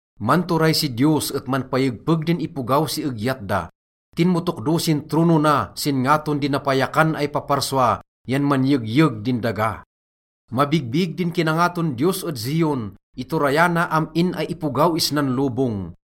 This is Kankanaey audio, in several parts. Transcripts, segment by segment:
Manturay si Diyos et manpayegpeg din ipogaw si egyat da. Tinmotokdo sin trono na sin ngaton di napayakan ay paparsua yan manyegyeg din daga. Mabigbig di kinangaton Diyos ed Zion, iturayana am-in ay ipogaw isnan lobong.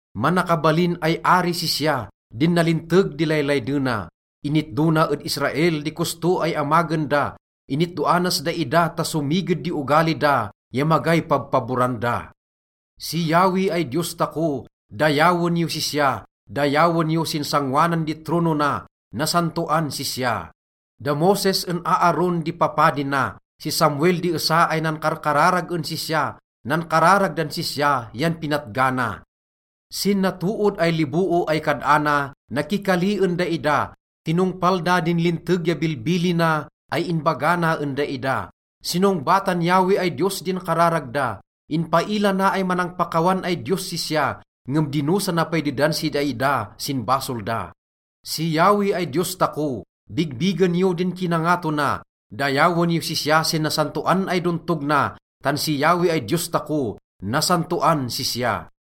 Manakabalin ay ari sisya, din nalinteg di laylaydena. Initdo na ed Israel di kosto ay amagen da, initdoanas daida ta somiged di ogali da ya magay pabpaboran da. Si Yahweh ay Diyos tako, dayawen yos sisya, dayawen yo sin sangoanan di trono na. Nasantoan sisya! Da Moses en Aaron din papadi na, si Samuel di esa ay nankarkararag en sisya, nankararag dan sisya yan pinatgana. Sin natood ay liboo ay kad-ana, nakikali en daida. Tinongpal da din linteg ya bilbilina ay inbaga na en daida. Sinongbatan Yahweh ay Diyos din kararag da, inpaila na ay manangpakawan ay Diyos sisya, ngem dinosa na pay dedan si daida sin basol da. Si Yahweh ay Diyos tako, bigbigen yo din kinangato na, dayawen yos sisya sin nasantoan ay dontog na, tan si Yahweh ay Diyos tako, nasantoan sisya.